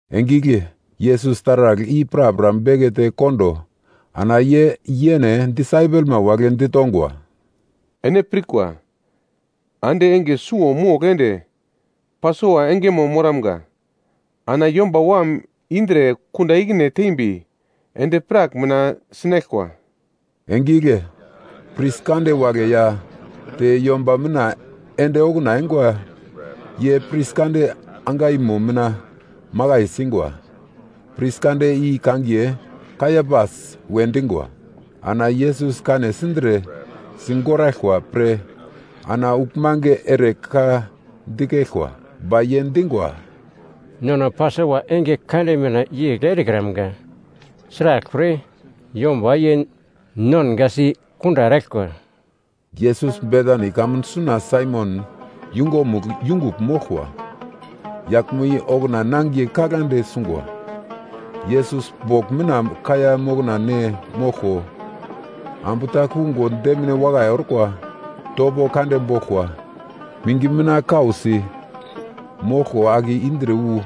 Enge igle Yesus taragl i prapra bekete kondo ana ye yene disaipelma wagle ditongwa, “Ene pirkwa, ande enge suwo mogl ende Pasova engemo moramga. Ana Yomba Wam indre kunda ikine tembi endi-prak mina sinaglkwa.” Enge igle pris kande wagle ya te yomba mina ende okuna eingwa, ye pris kande angaimo mina makai singwa. Pris kande i kangiye Kaiapas we dingwa. Ana Yesus kane sindre sigoraglkwa pre ana uglmange ere ka dikeglkwa. Ba ye dingwa, “Nono Pasova enge kande mina yegl erekramga. Sraglpre, yomba ye nongasi kunda eraglkwa.” Yesus Betani kamun suna Saimon yungumugl yungugl moglkwa, yaglmo i okuna nangiye kaglande sungwa. Yesus bogl mina kaiya mokna ne moglko, ambu ta kungo demine wakai orkwa, topo kande boglkwa mingi mina kausi moglko ake indre wu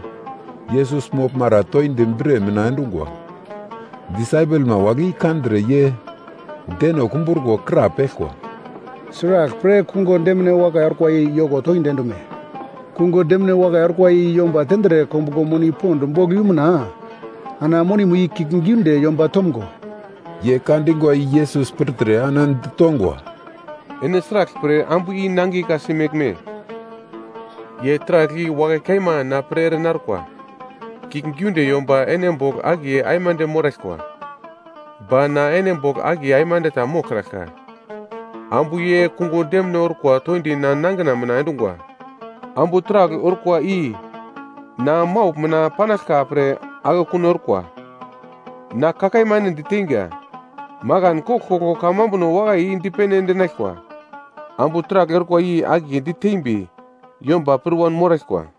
Yesus moglmara toindi bre mina endungwa. Disaipelma wagle i kandre ye deno kumbruko krapeglkwa, “Sraglpre kungo demine wakai orkwa i yoko toindi endume? Kungo demine wakai orkwa i yomba tendre kombuglo moni pond bogl yumuna, ana monimo i kiuglgiunde yomba tomgo.” Ye ka dingwa i Yesus pirtre ana ditongwa, “Ene sraglpre ambu i nangiye ka-si meglme? Ye taragl i wakai kaima na pre ere narkwa. Kiuglgiunde yomba ene bogl akiye aimande moraglkwa. Ba na ene bogl akiye aimande ta moglkraglka. Ambu ye kungo demine orkwa toindi na nangina mina endungwa. Ambu taragl orkwa i na maugl mina panaglka pre akekun orkwa. Na ka kaima ene diteinga, makan koglkoglo kamambuno wakai i dipene endinaglkwa, ambu taragl orkwa i akiye ditembi yomba pir wanmoraglkwa.”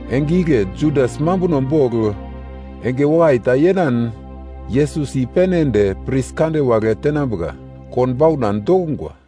Enge igle Judas mambuno bogl enge wakai ta yenan Yesus i-pene ende pris kande wagle tenambuka konbauna dokungwa.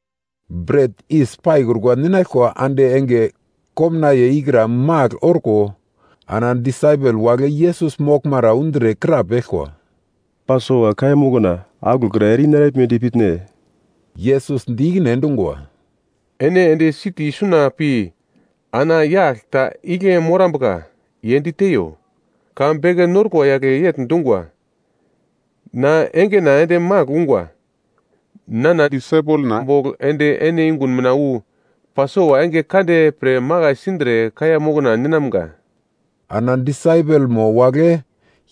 Bret yis paikrukwa ninaglkwa ande enge komnaiye ikra magl orko, ana disaipel wagle Yesus moglmara undre krapeglkwa, “Pasova kaiya mokna aglokra ere yei naraglmedi pitne?” Yesus di ikine endungwa, “Ene ende siti suna pi ana yagl ta igle morambuka ye diteiyo, ‘Ka beke narikwa yagle yegl dungwa, na engena ende magl ungwa. Nana disaipelna bogl ende ene yungun mina wu Pasova enge kande pre makai sindre kaiya mokna ninamga.’” Ana disaipelmo wagle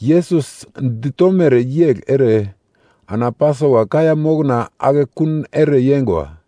Yesus ditomere yegl ere, ana Pasova kaiya mokna akekun ere yeingwa.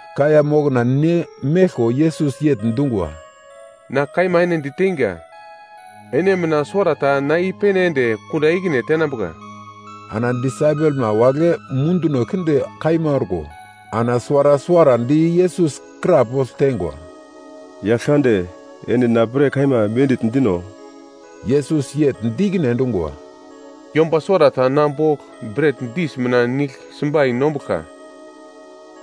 Kaiya mokna ne meglko Yesus yegl dungwa, “Na kaima ene diteinga, ene mina suwarata na i-pene ende kunda ikine tenambuka.” Ana disaipelma wagle munduno kinde kaima orko, ana suwara suwarandi Yesus krapogl teingwa, “Yaglkande, ene na pre kaima mendigl dino?” Yesus yegl di ikine endungwa, “Yomba suwarata na bogl bret dis mina nigl simbai nombuglka,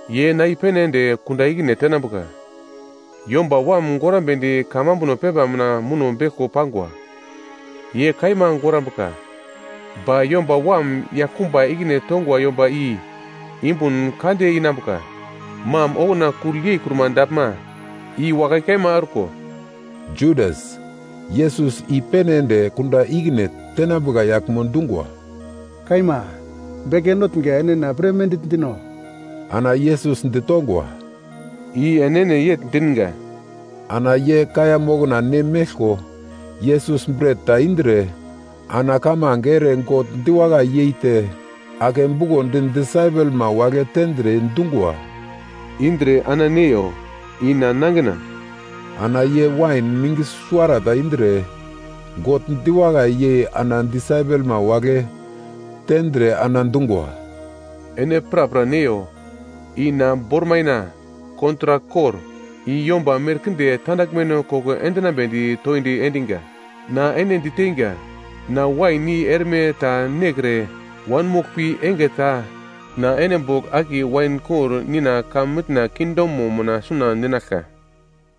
ye na i-pene ende kunda ikine tenambuka. Yomba Wam gorambedi kamambuno pepa mina muno beglko pangwa ye kaima gorambuka. Ba Yomba Wam yaglkumba ikine tongwa yomba i yumbun kande inambuka, mam okuna kugl yeikruma daglma i wakai kaima orko.” Judas, Yesus i-pene ende kunda ikine tenambuka yaglmo dungwa, “Kaima, beke notnga, ene na pre mendigl dino?” Ana Yesus ditongwa, “I enene yegl dinga.” Ana ye kaiya mokna ne meglko Yesus bret ta indre, ana kamange ere God diwakai yeite, ake bukondi disaipelma wagle tendre dungwa, “Indre ana neiyo, i na nangina.” Ana ye wain mingi suwarata indre, God diwakai yei ana disaipelma wagle tendre ana dungwa, “Ene prapra neiyo. I na bormaina kontrak kor, i yomba merkinde tandaglmeno koko endinambedi toindi endinga. Na ene diteinga, na wain i erme ta nekre wanmoglpi enge ta na ene bogl akiye wain kor Nina heven kingdomo mina suna ninaglka.”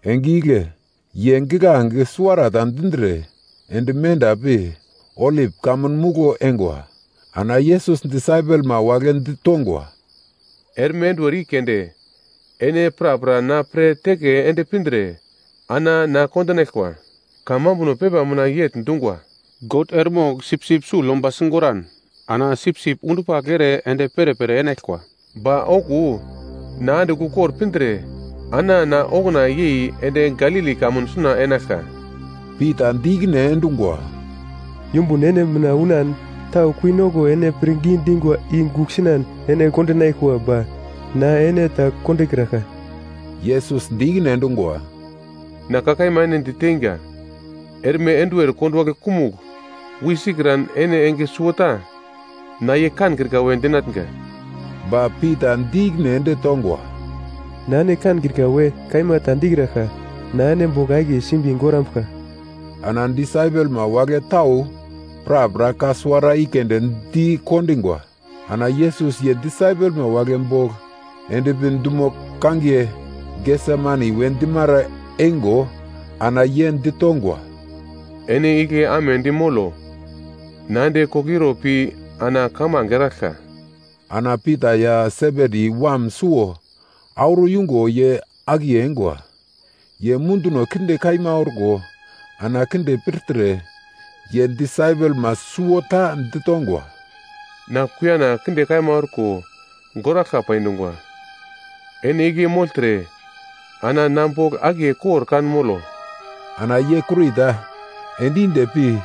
Enge igle ye giglange suwarata dindre, ende menda pi Olip Kamun Muglo eingwa. Ana Yesus disaipelma wagle ditongwa, “Erme enduwer i keunde ene prapra na pre teke ende pindre ana na kondinaglkwa. Kamambuno pepa mina yegl dungwa: “‘God eremogl sipsip sugl yomba sigoran, ana sipsip undupagl ere ende perepere enaglkwa.’ Ba okuwo na andigl ukor pindre, ana na okuna yei ende Galili kamun suna enaglka.” Pita di ikine endungwa, “Yumbun ene mina unan tau kuinoko ene pre pirngi dingwa i gugl sinan ene kondinaglkwa ba na ene ta kondokraglka.” Yesus di ikine endungwa, “Na ka kaima ene diteinga, erme enduwer konduwagle kumugl wi sikran ene enge suwota na ye kankrika we dinatnga.” Ba Pita di ikine ende tongwa, “Na ene kankrika we kaima ta dikraglka. Na ene bogl akiye simbi gorambuglka.” Ana disaipelma wagle tau prapra ka suwara i keunde dikondingwa. Ana Yesus ye disaipelma wagle bogl endpi dumo kangiye Gesemani we dimara eingo ana ye ditongwa, “Ene igle amedi molo. Na ende koglo iro pi ana kamange eraglka.” Ana Pita ya Sebedi wam suwo auro yungo ye akiye eingwa. Ye munduwo kinde kaima orko ana kinde pirtre. Ye disaipelma suwota ditongwa, “Na kuiyana kinde kaima orko goraglka pai dungwa, ene igle mogltre ana na bogl akiye kor kan molo.” Ana ye kurita ende inde pi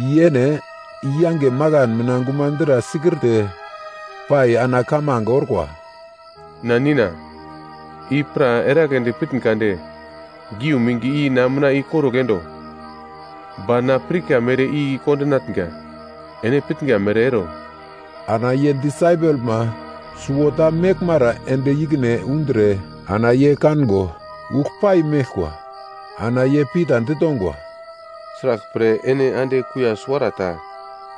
ye yene yange makan mina gumadra sikirte pai ana kamange orkwa, “Na Nina i pra eragledi pitn kade, geu mingi i na mina ikorugl endo. Ba na pirka mere i kondinatnga, ene pitnga mere ero.” Ana ye disaipelma suwota meglmara ende ikine undre ana ye kango ugl pai meglkwa, ana ye Pita ditongwa, “Sraglpre ene ande kuiya suwarata,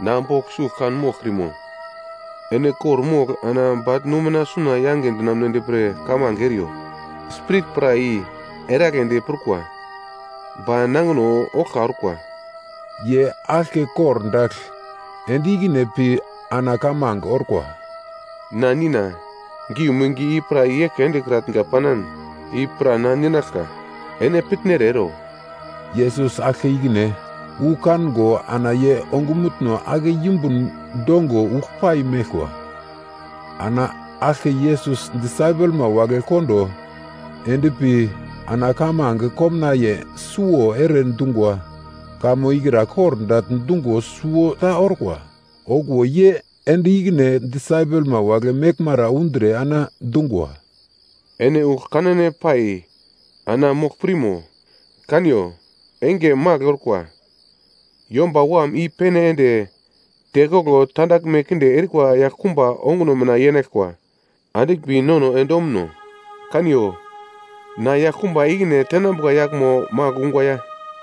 na bogl sugl kan moglkrimo? Ene kor-mogl ana bagl-nusi mina suna yange dinamunedi pre kamange eriyo. Spirit pra i eragledi prukwa, ba nangino oglka orkwa.” Ye aglke kordagl ende ikine pi ana kamange orkwa, “Na Nina, geu mingi i pra i-eglke endekratnga panan, i pra na ninaglka, ene pitnere ero.” Yesus aglke ikine wu kango ana ye ongumutno ake yumbun dongo uglpai meglkwa. Ana aglke Yesus disaipelma wagle kondo endpi ana kamange komnaiye suwo ere dungwa kamo ikra kordagl dungo suwota orkwa. Okuwo ye ende ikine disaipelma wagle meglmara undre ana dungwa, “Ene ugl kanane pai ana mogl pirmo? Kaniyo, enge magl orkwa. Yomba Wam i-pene ende tekoglo tandaglme kinde erikwa yaglkumba onguno mina yenaglkwa. Andiglmbi nono ende omuno. Kaniyo, na yaglkumba ikine tenambuka yaglmo magl ungwa ya!”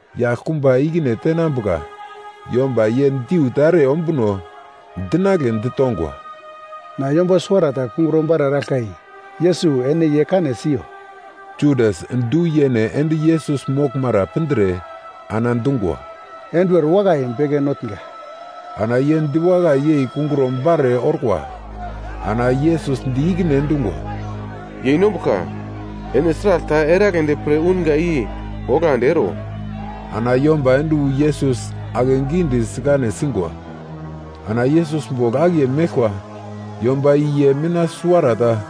Yaglkumba ikine tenambuka yomba ye diu ta ere ombuno dinagle ditongwa, “Na yomba suwarata kungro-bare eraglka, i Yesus, ene ye kane siyo.” Judas du-yene ende Yesus moglmara pindre ana dungwa, “Enduwer wakai, Beke Notnga.” Ana ye diwakai yei kungro-bare orkwa. Ana Yesus di ikine endungwa, “Yeinombuglka, ene sragl ta eragledi pre unga i oglandi ero.” Ana yomba ende wu Yesus akegidi sikane singwa. Ana Yesus bogl akiye meglkwa yomba i ye mina suwarata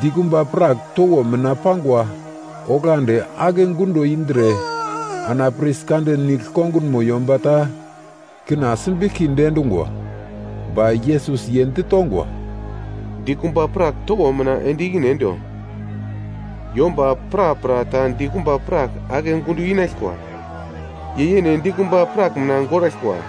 dikumba prak towo mina pangwa oglandi ake gundo indre ana pris kande nigl kongunmo yomba ta kina simbiglkidi endungwa. Ba Yesus ye ditongwa, “Dikumba prak towo mina ende ikine endo. Yomba prapra ta dikumba prak ake gundo inaglkwa, ye yene dikumba prak mina goraglkwa.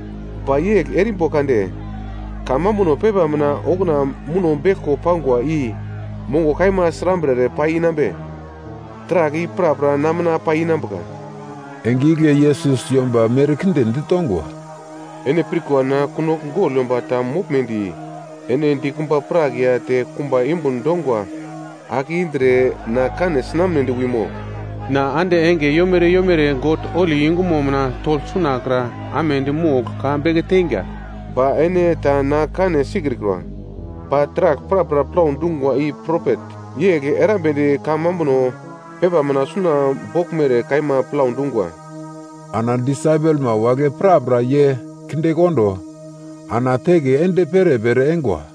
Ba yegl erimbo kande, kamambuno pepa mina okuna muno beglko pangwa i mongo kaima srambre ere pai inambe? Taragl i prapra na mina pai inambuka.” Enge igle Yesus yomba merkinde ditongwa, “Ene pirkwa na kunogl gogl yomba ta moglmedi ene dikumba prak ya te kumba yumbun dongwa ake indre na kane sinamnedi wimo? Na ande enge yomere yomere God holi yungumo mina togl sunakra amedi mogl ka beke teinga, ba ene ta na kane sikrikwa. Ba taragl prapra plau dungwa i propet yegl erambedi kamambuno pepa mina suna boglmere kaima plau dungwa.” Ana disaipelma wagle prapra ye kindekondo ana teke ende perepere eingwa.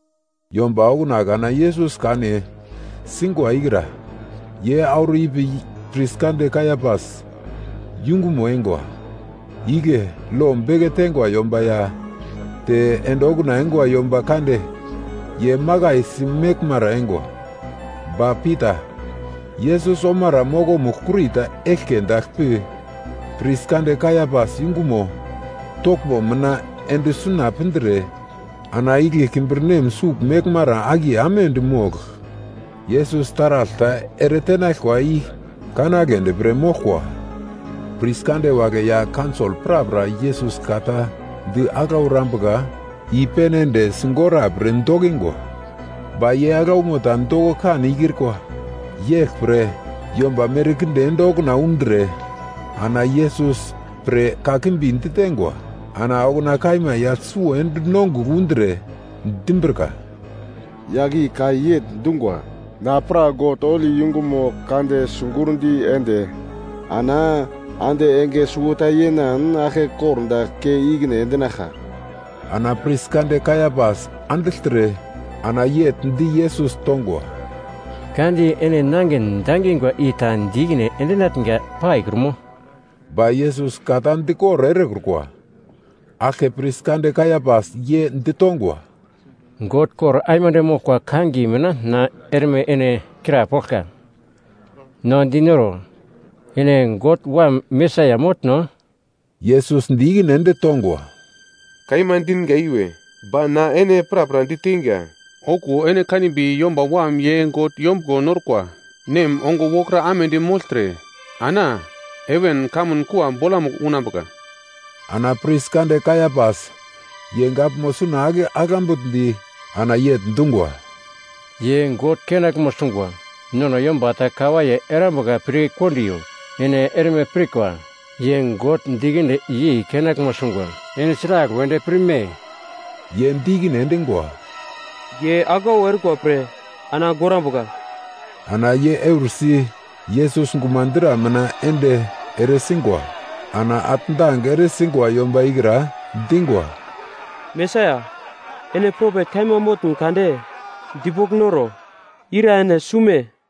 Yomba okuna kana Yesus kane singwa ikra, ye auro ipi pris kande Kaiapas, yungumo eingwa. Igle lo beke teingwa yomba ya te ende okuna eingwa yomba kande ye makaisi meglmara eingwa. Ba Pita, Yesus omara mokomugl kurita eglke dagl pi, pris kande Kaiapas yungumo toglmo mina ende suna pindre, ana igle kimbirnem sugl meglmara akiye amedi mogl, Yesus taragl ta ere tenaglkwa i kanagledi pre moglkwa. Pris kande wagle ya kaunsol prapra Yesus ka ta di aglau erambuka i-pene ende sigora pre dokingwa. Ba ye aglaumo ta doko kan ikrikwa. Yeglpre yomba merkinde ende okuna undre ana Yesus pre kakimbi ditengwa. Ana okuna kaima yagl suwo ende nongugl undre, dimbrika, “Yagl i ka yegl dungwa, ‘Na pra God holi yungumo kande sigurndi ende, ana ande enge suwota yenan aglke kordagl kei ikine endinaglka.’” Ana pris kande Kaiapas andigltre ana yegl di Yesus tongwa, “Ka di ene nangin dangingwa i ta di ikine endinatnga paikrumo?” Ba Yesus ka ta dikor erekrukwa. Aglke pris kande Kaiapas, ye ditongwa, “God kor aimande moglkwa kangiye mina na erme ene krapoglka. No dinoro, ene God Wam Mesaia motno?” Yesus di ikine ende tongwa, “Kaima dinga iwe. Ba na ene prapra diteinga, okuwo ene kanimbi Yomba Wam ye God Yombuglo Norkwa Nem ongo wokra amedi mogltre ana heven kamun kua bolamugl unambuka.” Ana pris kande Kaiapas ye gaglmo suna ake aglambugldi ana yegl dungwa, “Ye God kenaglmo sungwa, nono yomba ta kawaiye erambuka pir kondiyo. Ene erme pirkwa, ye God dikinde yei kenaglmo sungwa. Ene sragl wedi pirme?” Ye di ikine endingwa, “Ye aglau orkwa pre ana gorambuka.” Ana ye eursi Yesus gumadra mina ende eresingwa. Ana atndang ere singwa yomba ikra, dingwa, “Mesaia, ene propet kaima motn kade dipogl noro, ira ene sume?”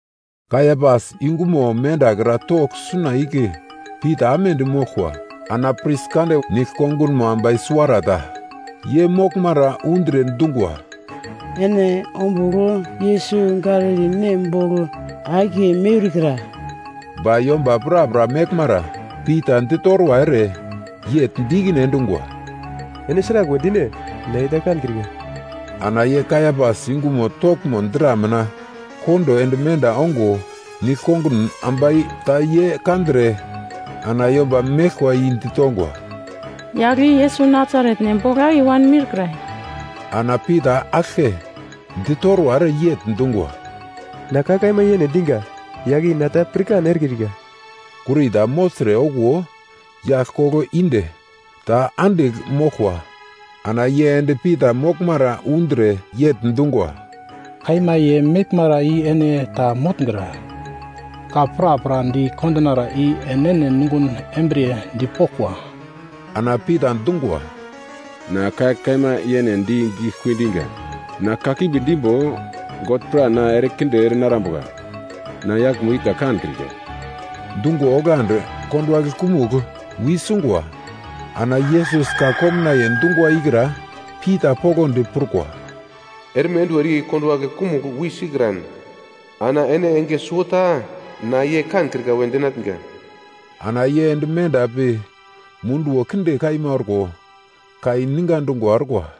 Kaiapas yungumo mendakra togl suna igle Pita amedi moglkwa, ana pris kande nigl kongunmo ambai suwarata ye moglmara undre dungwa, “Ene ombugl Yesus Galili nem bogl akiye miurkra.” Ba yomba prapra meglmara Pita ditorwa ere yegl di ikine endungwa, “Ene sraglwe dine? Na ye ta kankrika.” Ana ye Kaiapas yungumo toglmo dra mina kondo ende menda ongo, nigl-kongun ambai ta ye kandre ana yomba meglkwa i ditongwa, “Yagl i Yesus Nasaret nem bogl akiye wanmiurkra.” Ana Pita aglke ditorwa ere yegl dungwa, “Na ka kaima yene dinga, yagl i na ta pirkan erekrika!” Kurita mogltre okuwo yagl koglo inde ta andigl moglkwa, ana ye ende Pita moglmara undre yegl dungwa, “Kaima ye meglmara i ene ta motngra. Ka prapra di kondinara i enene nungun embriye dipoglkwa.” Ana Pita dungwa, “Na ka kaima yene di giglekui dinga. Na kakimbi dimbo, God pra na erekinde ere narambuka. Na yaglmo i ta kankrika!” Dungo oglandi konduwagle kumugl wi sungwa. Ana Yesus ka komnaiye dungwa ikra Pita poglodi prukwa: “Erme enduwer i konduwagle kumugl wi sikran, ana ene enge suwota na ye kankrika we dinatnga.” Ana ye ende menda pi munduwo kinde kaima orko, kai ninga dungwa orkwa.